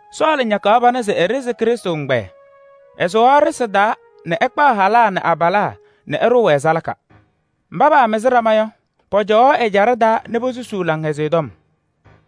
Sɔɔlɩ ñakaɣ pana se eɖezi Krɩstʋ ɛgbɛyɛ: ɛsʋwaɣ ɖɩsɩ taa nɛ ɛkpaɣ halaa nɛ abalaa nɛ ɛɖʋʋ-wɛ salaka. Mba paamɩzɩ ɖama yɔ, pɔcɔwaɣ ɛjaɖɛ taa nɛ posusuu Laŋhɛzɩyɛ Tɔm.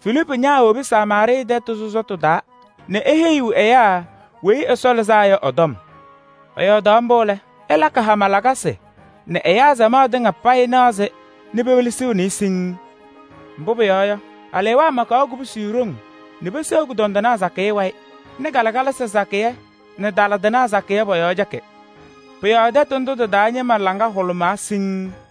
Filiipu ñaawobi Samaarɩɩ tɛtʋ sɔsɔtʋ taa nɛ eheyiɣ ɛyaa Weyi Ɛsɔ Lɩzaa Yɔ ɛ-tɔm. Ɛyɔɔdaɣ mbʋ lɛ, ɛlakɩ hama lakasɩ nɛ ɛyaa samaɣ tɩŋa payɩ naɣ-sɩ nɛ pewelesiɣni-i siŋŋ. Mbʋ pʋyɔɔ yɔ, alewaa makaɣ kubusi ɖoŋ nɛ peseɣ kʋdɔndɩnaa sakɩyɛ wayɩ nɛ kalɩkalasɩ sakɩyɛ nɛ taladɩnaa sakɩyɛ pɔ-yɔɔ cɛkɩ. Pʋ-yɔɔ tɛtʋ ndʋ tɩ-taa ñɩma laŋa hʋlʋmaa siŋŋ.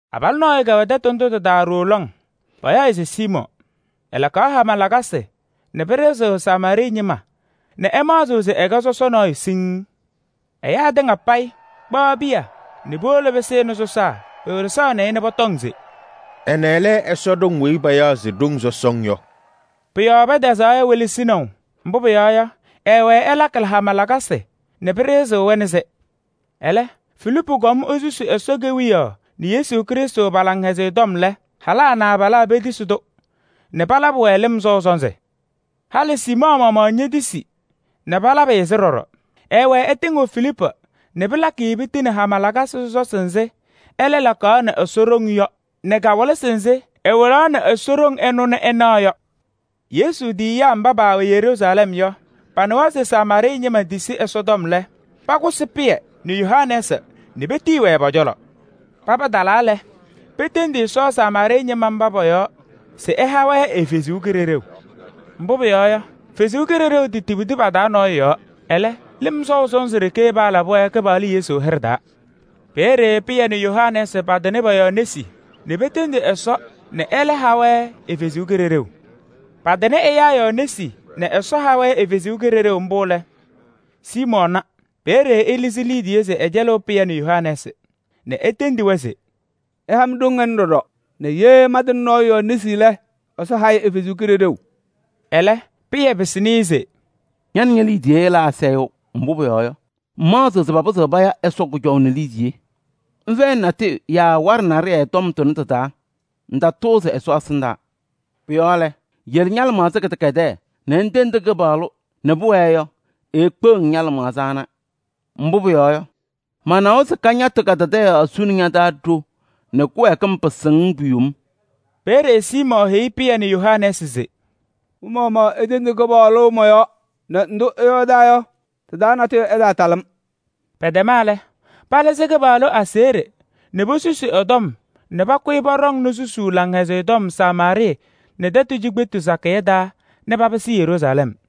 Abalʋ nɔɔyʋ kɛwɛ tɛtʋ ndʋ tɩ-taa ɖooo lɔŋ, payaɣ-ɩ se Siimɔɔ. Ɛlakaɣ hama lakasɩ nɛ pɩɖɩɣzɩɣ Samaarɩɩ ñɩma nɛ ɛmaɣzɩɣ se ɛkɛ sɔsɔ nɔɔyʋ siŋŋ. Ɛyaa tɩŋa payɩ, kpaɣ piya nɛ puwolo pɩsɩnɩ sɔsaa pewelesaɣnɩ-ɩ nɛ pɔtɔŋ se: “Ɛnɛ lɛ Ɛsɔ ɖoŋ weyi payaɣ se: ‘Ɖoŋ sɔsɔŋ’ yɔ.” Pʋ-yɔɔ pɛtɛzaɣ-ɩ welesinaʋ, mbʋ pʋyɔɔ yɔ, ɛwɛɛ ɛlakɩ hama lakasɩ nɛ pɩɖɩɣzɩɣ-wɛ nɛ sɩ. Ɛlɛ, Filiipu kɔm esusi Ɛsɔ Kewiyaɣ nɛ Yesu Krɩstʋ pa-Laŋhɛzɩyɛ tɔm lɛ, halaa nɛ abalaa petisi-tʋ nɛ palabɩ-wɛ lɩm sɔʋ sɔnzɩ. Halɩ Siimɔɔ maɣmaɣ ñetisi nɛ palabɩ-ɩ-sɩ ɖɔɖɔ. Ɛɛwɛɛ ɛtɩŋɩɣ Filiipu nɛ pɩlakɩ-ɩ piti nɛ hama lakasɩ sɔsɔsɩ nzɩ ɛlɛ lakaɣnɩ Ɛsɔ ɖoŋ yɔ nɛ kawɩlɩsɩ nzɩ ɛwɩlaɣnɩ ɖoŋ ɛnʋ nɛ ɛnaɣ yɔ. Yesu tiyiyaa mba paawɛ Yeruusalɛm yɔ, panɩwa se Samaarɩɩ ñɩma tisi Ɛsɔtɔm lɛ, pakʋsɩ Pɩyɛ nɛ Yohanɛɛsɩ nɛ petiyi-wɛ pɔ-cɔlɔ. Paba talaa lɛ, petendi Ɛsɔ Samaarɩɩ ñɩma mba pɔ-yɔɔ se ɛha-wɛ ɛ-Kalɩzaɣ. Mbʋ pʋyɔɔ yɔ, Ɛsɔ Kalɩzaɣ tetibidi pa-taa nɔɔyʋ yɔɔ. Ɛlɛ, lɩm sɔʋ sɔnzɩ ɖeke paalabɩ-wɛ Kɩpaɣlʋ Yesu hɩɖɛ taa. Peeye Pɩyɛ nɛ Yohanɛɛsɩ patɩnɩ pɔ-yɔɔ nesi nɛ petendi Ɛsɔ nɛ ɛlɛ ha-wɛ ɛ-Kalɩzaɣ. Patɩnɩ ɛyaa yɔɔ nesi nɛ Ɛsɔ ha-wɛ ɛ-Kalɩzaɣ mbʋ lɛ, Siimɔɔ na. Peeye ɛlɩzɩ liidiye se ɛcɛlɩɣ Pɩyɛ nɛ Yohanɛɛsɩ nɛ etendi-wɛ se: “Ɩha-m ɖoŋ ɛnʋ ɖɔɖɔ nɛ ye mantɩnɩ nɔɔyʋ yɔɔ nesi lɛ, Ɛsɔ ha-ɩ ɛ-Kalɩzaɣ.” Ɛlɛ, Pɩyɛ pɩsɩnɩ-ɩ se: “Ña nɛ ñe-liidiye ɩla asayʋʋ! Mbʋ pʋyɔɔ yɔ, ŋmaɣzɩɣ se papɩzɩɣ paya Ɛsɔ kʋjɔʋ nɛ liidiye. Ŋfɛyɩnɩ natʋyʋ yaa waɖɛ naɖɩyɛ tɔm tʋnɛ tɩ-taa, ŋtatʋʋzɩ Ɛsɔ ɛsɩndaa. Pʋ-yɔɔ lɛ, yele ña-lɩmaɣza kɩdɛkɛdɛɛ nɛ ŋtendi Kɩpaɣlʋ nɛ pʋwɛɛ yɔ, eekpeɣ-ŋ ña-lɩmaɣza ana. Mbʋ pʋyɔɔ yɔ, manawa se kañatʋ kadadaɣyaɣ suni ña-taa ɖo nɛ kɩwɛɛkɩm pɩsɩ-ŋ pu-yom.” Peeye Siimɔɔ heyi Pɩyɛ nɛ Yohanɛɛsɩ se: “Mɩ-maɣmaɣ itendi Kɩpaɣlʋ mɔ-yɔɔ nɛ ndʋ ɩyɔɔdaa yɔ, tɩ-taa natʋyʋ ɛtaatalɩ-m.” Pɛtɛma lɛ, palɩzɩ Kɩpaɣlʋ aseɣɖe nɛ posusi ɛ-tɔm nɛ pakʋyɩ pɔɖɔŋnɩ susuu Laŋhɛzɩyɛ Tɔm Samaarɩɩ tɛtʋ cikpetu sakɩyɛ taa nɛ papɩsɩ Yeruusalɛm.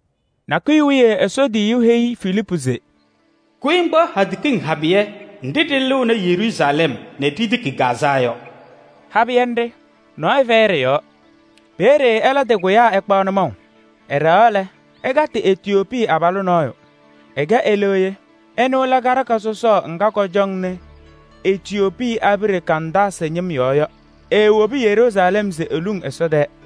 Nakʋyʋ wiye Ɛsɔ tiyiyu nɔɔyʋ heyi Filiipu se: “Kʋyɩ ŋkpaɣ hadɛ kiŋ habɩyɛ nɖɩ ɖɩlɩɣnɩ Yeruusalɛm nɛ ɖitiki Gaazaa yɔ.” Habɩyɛ nɖɩ, nɔɔyʋ fɛyɩ ɖɩ-yɔɔ. Peeye ɛlɛ tɩkʋyaa ɛkpaɣ nʋmɔʋ. Ɛɖɛɣaɣ lɛ, ɛkatɩ Etiyoopii abalʋ nɔɔyʋ, ɛkɛ eleɣye. Ɛnʋ lɛ karɩka sɔsɔɔ ŋga kɔcɔŋnɩ Etiyoopii abiɖe Kandaasɩ ñɩm yɔɔ yɔ. Eewobi Yeruusalɛm se eluŋ Ɛsɔ tɛɛ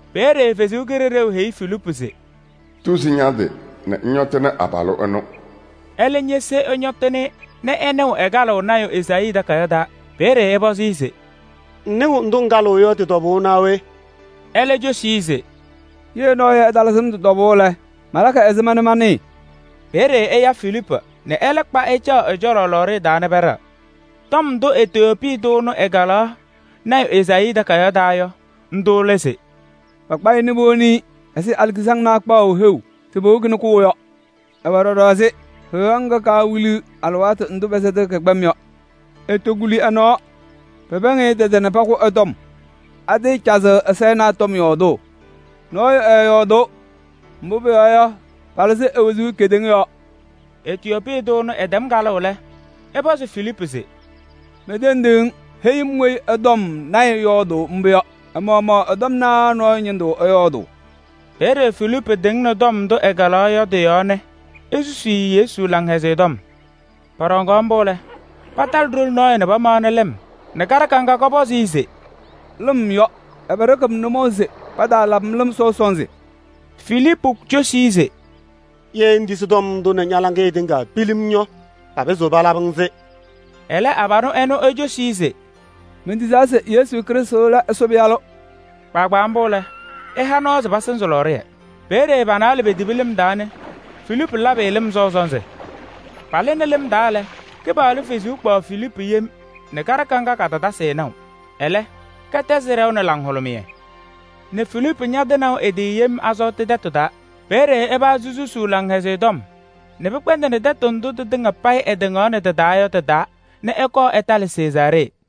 Peeye Ɛsɔ Kalɩzaɣ heyi Filiipu se: “Tuzi ña-tɩ nɛ ŋñɔtɩnɩ abalʋ ɛnʋ.” Ɛlɛ ñese ɛñɔtɩnɩ-ɩ nɛ ɛnɩɣ ɛkalɩɣ lɔɔyaɣ tʋ Ezaayii takayaɣ taa. Peeye ɛpɔzɩ-ɩ se: “Ŋnɩɣ ndʋ ŋkalɩɣ yɔ tɩ-tɔbʋʋ naa we?” Ɛlɛ cosi-i se: “Ye nɔɔyʋ ɛtalɩzɩ-m tɩ-tɔbʋʋ lɛ, malakɩ ɛzɩma nɛ manɩɩ?” Peeye ɛya Filiipu nɛ ɛlɛ kpa ɛcaɣ ɛ-cɔlɔ lɔɔɖɩyɛ taa nɛ pɛɖɛɣ. Tɔm ndʋ Etiyoopii tʋ ɛnʋ ɛkalaɣ lɔɔyaɣ tʋ Ezaayii takayaɣ taa yɔ, ndʋ lɛ se: “Pakpa-ɩ nɛ powoni-i ɛzɩ alikizaŋnaa kpaʋ heu se powokini kʋʋ yɔ. Ɛwɛ ɖɔɖɔ ɛzɩ heɣa ŋga pɛsɛtɩɣ kɛ-kpɛm nɛ kaawiliɣ yɔ. Etokuli ɛ-nɔɔ. Pɛpɛɛŋ-ɩ tɛtɛ nɛ pakʋ ɛ-tɔm. Atɩɩcazɩɣ ɛ-sayɩnaa tɔm yɔɔdʋʋ? Mbʋ pʋyɔɔ yɔ, palɩzɩ e-wezuu kedeŋa yɔɔ.” Etiyoopii tʋ ɛnʋ ɛtɛm kalʋʋ lɛ, ɛpɔzɩ Filiipu se: “Mentendi-ŋ, heyi-m weyi ɛ-tɔm lɔɔyaɣ tʋ yɔɔdʋʋ mbʋ yɔ. Ɛ-maɣmaɣ ɛ-tɔm naa nɔɔyʋ ñɩndʋ ɛyɔɔdʋʋ?” Peeye Filiipu tɩŋnɩ tɔm ndʋ ɛkalaɣ yɔ tɩ-yɔɔ nɛ esusi-i Yesu Laŋhɛzɩyɛ Tɔm. Pɔɖɔŋaɣ mbʋ lɛ, patalɩ ɖoli nɔɔyʋ nɛ pamaɣnɩ lɩm nɛ kaɖɩka ŋga kɔpɔzɩ-ɩ se: “Lɩm yɔ! Ɛbɛ ɖɩkɩɣ-m nʋmɔʋ se pataalabɩ-m lɩm sɔʋ sɔnzɩ?” [ Filiipu cosi-i se: “Ye ŋtisi tɔm ndʋ nɛ ña-laŋɩyɛ tɩŋa pilim yɔ, papɩzɩɣ palabɩ-ŋ-sɩ.” Ɛlɛ abalʋ ɛnʋ ecosi-i se: “Mentisaa se Yesu Krɩstʋ lɛ Ɛsɔ Pɩyalʋ.”] Kpaagbaa mbʋ lɛ, ɛha nɔɔ se pasɩzɩ lɔɔɖɩyɛ. Peeye pa-naalɛ petibi lɩm taa nɛ Filiipu labɩ-ɩ lɩm sɔʋ sɔnzɩ. Palɩnɩ lɩm taa lɛ, Kɩpaɣlʋ Kalɩzaɣ kpaɣ Filiipu yem nɛ kaɖɩka ŋga katatasɩ-ɩ naʋ. Ɛlɛ kɛtɛzɩ ɖɛʋ nɛ laŋhʋlʋmɩyɛ nɛ Filiipu ñatɩnaʋ ɛ-tɩ yem Azɔɔtɩ tɛtʋ taa. Peeye ɛpazɩ susuu Laŋhɛzɩyɛ Tɔm nɛ pɩkpɛndɩnɩ tɛtʋ ndʋ tɩtɩŋa payɩ ɛtɩŋaɣnɩ tɩ-taa yɔ tɩ-taa nɛ ɛkɔɔ ɛtalɩ Sezaaree.